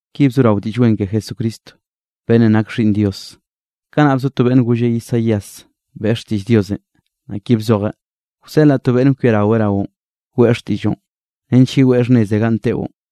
Ki bzorao Diꞌll Wen ke Jesucristo, beꞌnnenꞌ nak Xhiꞌnn Dios. Kanaꞌ bzo to beꞌnn golle Isaías, beꞌe xtiꞌll Diosenꞌ, naꞌ ki bzojeꞌ: Wseꞌlaꞌ to beꞌnn kwiaraweꞌ raoꞌn, weꞌe xtiꞌlloꞌn, nench yeweꞌ xhnneze ganꞌ teꞌon.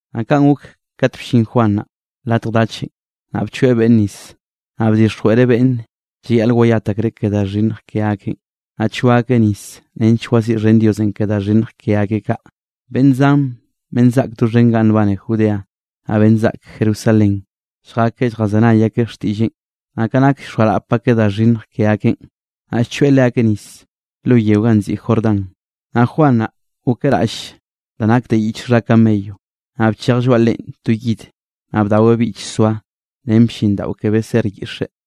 Naꞌ kaꞌn gok kat bllin Juan naꞌ latj dachenꞌ, naꞌ bchoeꞌ beꞌnn nis, naꞌ bdixjweꞌreꞌ beꞌnne llayaꞌl wayat akreꞌ ke da xhinnj ke akeꞌn, naꞌ choaꞌ akeꞌ nis nench waziꞌxhen Diosenꞌ ke da xhinnj ke akeꞌ kaꞌ. Beꞌnn zan beꞌnn zaꞌk doxhen ganꞌ nbane Judea, naꞌ beꞌnn zaꞌk Jerusalén lljakeꞌ lljazenay akeꞌ xtiꞌlleꞌn, naꞌ ka nak llxoarap akeꞌ da xhinnj ke akeꞌn, naꞌ llchoeꞌ leakeꞌ nis lo yeo ganꞌ nziꞌi Jordán. Naꞌ Juan naꞌ gokeꞌ raꞌll da nak de yich xha camello, naꞌ bchej lloaꞌ leꞌen to yid, naꞌ bdaweꞌ bichsoa ren blliꞌndaꞌo ke beser yiꞌxe.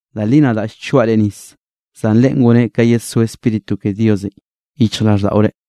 Da li nadaꞌ llchoaꞌ reꞌ nis, zan Leꞌe goneꞌ ka yedsó Spíritu ke Diosenꞌ yichjraꞌlldaꞌore.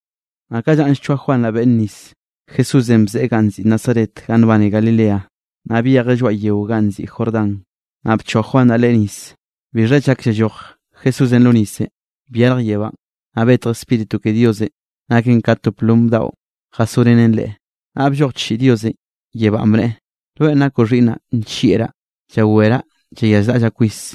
Naꞌ ka llanꞌ llchoaꞌ Juan naꞌ beꞌnn nis, Jesúsenꞌ bzeꞌe ganꞌ nziꞌi Nazaret ganꞌ nbane Galileanꞌ, naꞌ byejeꞌ lloaꞌ yeo ganꞌ nziꞌi Jordán, naꞌ bchoaꞌ Juan naꞌ Leꞌe nis. Bixha chak llalloj Jesúsenꞌ lo nisenꞌ, byarj yebánꞌ, naꞌ betj Spíritu ke Diosenꞌ, naken ka to plom daꞌo jasorenen Leꞌe. Naꞌ blloj chiꞌi Diosenꞌ yebánꞌ, bneꞌe: —Rweꞌ nakoꞌ xhiꞌnnaꞌ nllieꞌraꞌ, llaweraꞌ llayazraꞌllaꞌ kwis.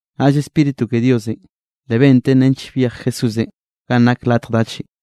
Naꞌll Spíritu ke Diosenꞌ, le benten nench byej Jesúsenꞌ ganꞌ nak latj dachenꞌ.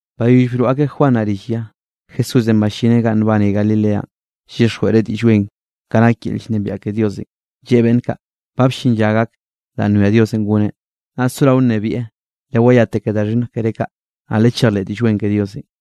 Bayoll broꞌ akeꞌ Juan naꞌ rill ya, Jesúsenꞌ ballineꞌ ganꞌ nbane Galileanꞌ llyixjweꞌreꞌ Diꞌll Wen, ka nak yel llnebiaꞌ ke Diosenꞌ. Lleꞌe beꞌnn kaꞌ: —Ba bllin lla gak danꞌ nwia Diosenꞌ goneꞌ, naꞌ sorao nnebieꞌ, lewayate ke da xhinnj keré kaꞌ, naꞌ lechejleꞌ Diꞌll Wen ke Diosenꞌ.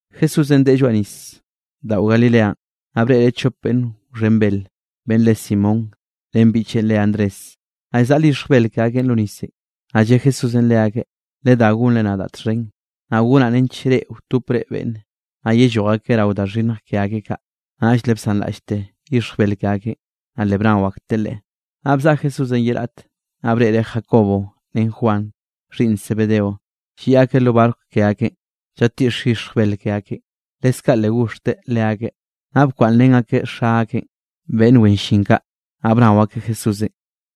Jesúsenꞌ deꞌe lloaꞌ nisdaꞌo Galileanꞌ, naꞌ breꞌreꞌ chop beꞌnn wxhen bel, beꞌnn re Simón ren biꞌcheꞌn re Andrés, naꞌ llzaꞌl yixj bel ke akeꞌn lo nisenꞌ. Naꞌll lle Jesúsenꞌ leakeꞌ: —Ledá gonre nadaꞌ txhen, naꞌ gonaꞌ nench reꞌ wtopre beꞌnne, naꞌ yelloj akeꞌ rao da xhinnj ke akeꞌ kaꞌ. Naꞌll le bsanraꞌllte yixj bel ke akeꞌn, naꞌ le bnao akteꞌ Leꞌe. Naꞌ bzaꞌa Jesúsenꞌ ye raꞌte, naꞌ breꞌreꞌ Jacobo ren Juan, xhiꞌnn Zebedeo, lliꞌ akeꞌ lo barco ke akeꞌn llatiꞌx yixj bel ke akeꞌn. Leskaꞌ le goxhteꞌ leakeꞌ, naꞌ bkwaꞌnnrén akeꞌ xa akeꞌn beꞌnn wen llin kaꞌ, naꞌ bnao akeꞌ Jesúsenꞌ.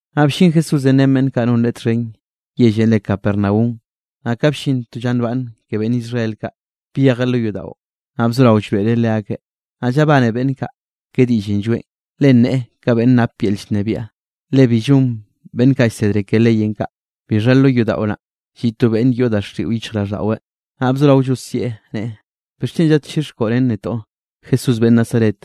Naꞌ bllin Jesúsenꞌ ren beꞌnn kaꞌ non Leꞌe txhen yellenꞌ re Capernaum, naꞌ ka bllin to lla nbaꞌnne ke beꞌnn Israel kaꞌ, byejeꞌ lo yodaꞌo, naꞌ bzorao llroeꞌreꞌ leakeꞌ. Naꞌ llabane beꞌnn kaꞌ ke diꞌllenꞌ lloeꞌn, le nneꞌe ka beꞌnn nap yel llnebiaꞌ, le bi llon beꞌnn kaꞌ llsedre ke leyenꞌ kaꞌ. Bixha lo yodaꞌo naꞌ, lliꞌ to beꞌnn yoꞌ daxiꞌo yichjraꞌlldaꞌweꞌ, naꞌ bzorao llosieꞌ neꞌe: —¿Bixchen zadchixkoꞌ ren netoꞌ, Jesús beꞌnn Nazaret?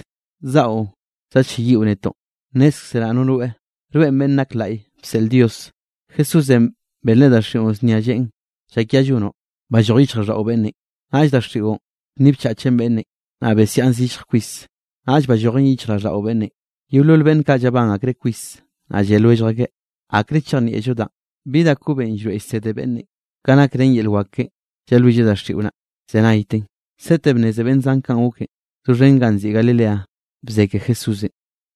¿Zaꞌo zadlleyiꞌo netoꞌn? Nnézkzeraꞌ no rweꞌ, rweꞌn Beꞌnn Nak Laꞌy bseꞌl Diosenꞌ. Jesúsenꞌ benreꞌ daxiꞌon znia lleꞌen: —¡Llakia llonoꞌ, balloj yichjraꞌlldaꞌo beꞌnnenꞌ! Naꞌll daxiꞌon bnnibchachen beꞌnnenꞌ, naꞌ besiaꞌn zillj kwis, naꞌll ballojen yichjraꞌlldaꞌo beꞌnnenꞌ. Yeolol beꞌnn kaꞌ llabán akreꞌ kwis, naꞌll lle lwellj akeꞌ: —¿Akre chejnieꞌllo danꞌ? ¿Bi da kobenꞌ llroeꞌ llsede beꞌnnenꞌ? Ka naken ren yel wak keꞌen llalwilleꞌ daxiꞌon naꞌ llzenayten. Sete bnneze beꞌnn zan kanꞌ goken, doxhen ganꞌ nziꞌi Galileanꞌ bze ke Jesúsenꞌ.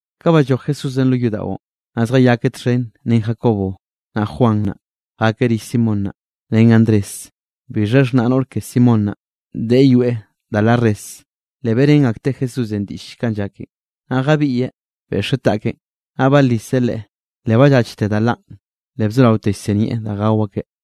Ka balloj Jesúsenꞌ lo yodaꞌon, naꞌ zjayakeꞌ txhen ren Jacobo, naꞌ Juan naꞌ, jakeꞌ rill Simón naꞌ, ren Andrés. Bixha xhnaꞌ noꞌr ke Simón naꞌ, deꞌe yoeꞌ da la res, le beꞌrén akteꞌ Jesúsenꞌ diꞌll kanꞌ llaken. Naꞌ jabiꞌyeꞌ, beꞌxeꞌ taꞌkeꞌn, naꞌ baliseꞌ leꞌe, le ballachte da lanꞌ, le bzoraote llsinieꞌ da gao akeꞌ.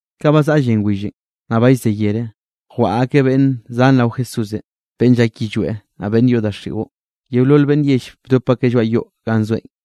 Ka ba zaꞌa llen willenꞌ, naꞌ ba llze yere, jwaꞌa akeꞌ beꞌnn zan rao Jesúsenꞌ beꞌnn llak yillweꞌ, naꞌ beꞌnn yoꞌ daxiꞌo. Yeolol beꞌnn yell bdop akeꞌ lloaꞌ yoꞌ ganꞌ zoeꞌn.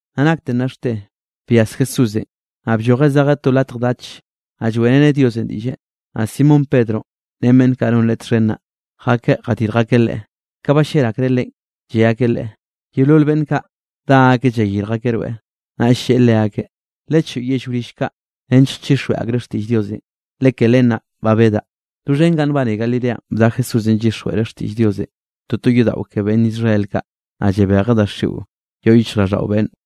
Naꞌ nakte nnaxte byas Jesúsenꞌ, naꞌ bllojeꞌ zejeꞌ to latj dach, naꞌ lloeꞌreneꞌ Diosenꞌ diꞌlle. Naꞌ Simón Pedro ren beꞌnn kaꞌ non leꞌe txhen naꞌ, jakeꞌ jadirj akeꞌ Leꞌe. Ka ballel akreꞌ Leꞌen, lle akeꞌ Leꞌe: —Yeolol beꞌnn kaꞌ dá akeꞌ llayirj akeꞌ rweꞌ. Naꞌll lleꞌe leakeꞌ: —Lechoꞌo yell wrill kaꞌ nench chixjweꞌ akreꞌ xtiꞌll Diosenꞌ, le ke len naꞌ ba bedaꞌ. Doxhen ganꞌ nbane Galileanꞌ bda Jesúsenꞌ llyixjweꞌreꞌ xtiꞌll Diosenꞌ toto yodaꞌo ke beꞌnn Israel kaꞌ, naꞌ llabejeꞌ daxiꞌo yoꞌ yichjraꞌlldaꞌo beꞌnne.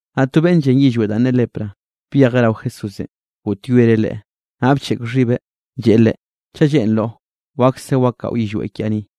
Naꞌ to beꞌnn llen yillweꞌ danꞌ ne lepra, byejeꞌ rao Jesúsenꞌ, goꞌtyoereꞌ Leꞌe, naꞌ bcheꞌk xhibeꞌ lleꞌe Leꞌe: —Chaꞌ lleꞌnroꞌ, wakse wakaꞌo yillweꞌ kiaꞌ ni.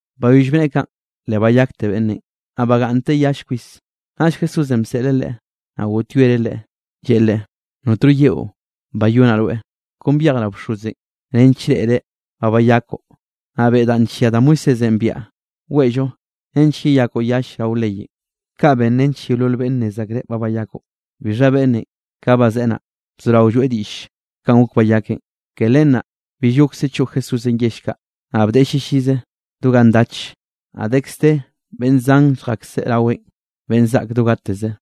Bayoll bneꞌe kaꞌn, le bayakte beꞌnnenꞌ, naꞌ bagaꞌnnteꞌ yall kwis. Naꞌll Jesúsenꞌ baseꞌleꞌ leꞌe, naꞌ goꞌtyoereꞌ leꞌe, lleꞌe leꞌe: —Notno yeꞌo bayonaꞌ rweꞌ, kon byej rao bxozenꞌ nench reꞌreꞌ ba bayakoꞌ, naꞌ beꞌe danꞌ nllia da Moisésenꞌ biaꞌa weꞌllo, nench yeyakoꞌ yall rao leyenꞌ. Kaꞌ ben nench yeolol beꞌnne nnez akreꞌ ba bayakoꞌ. Bixha beꞌnnenꞌ ka bazeꞌe naꞌ, bzorao lloeꞌ diꞌll kanꞌ gok bayakeꞌn. Ke len naꞌ bill gokse choꞌ Jesúsenꞌ yell kaꞌ, naꞌ bdeꞌe llillize do ga ndach, naꞌ dekz de beꞌnn zan lljakse raweꞌn beꞌnn zaꞌk do gateze.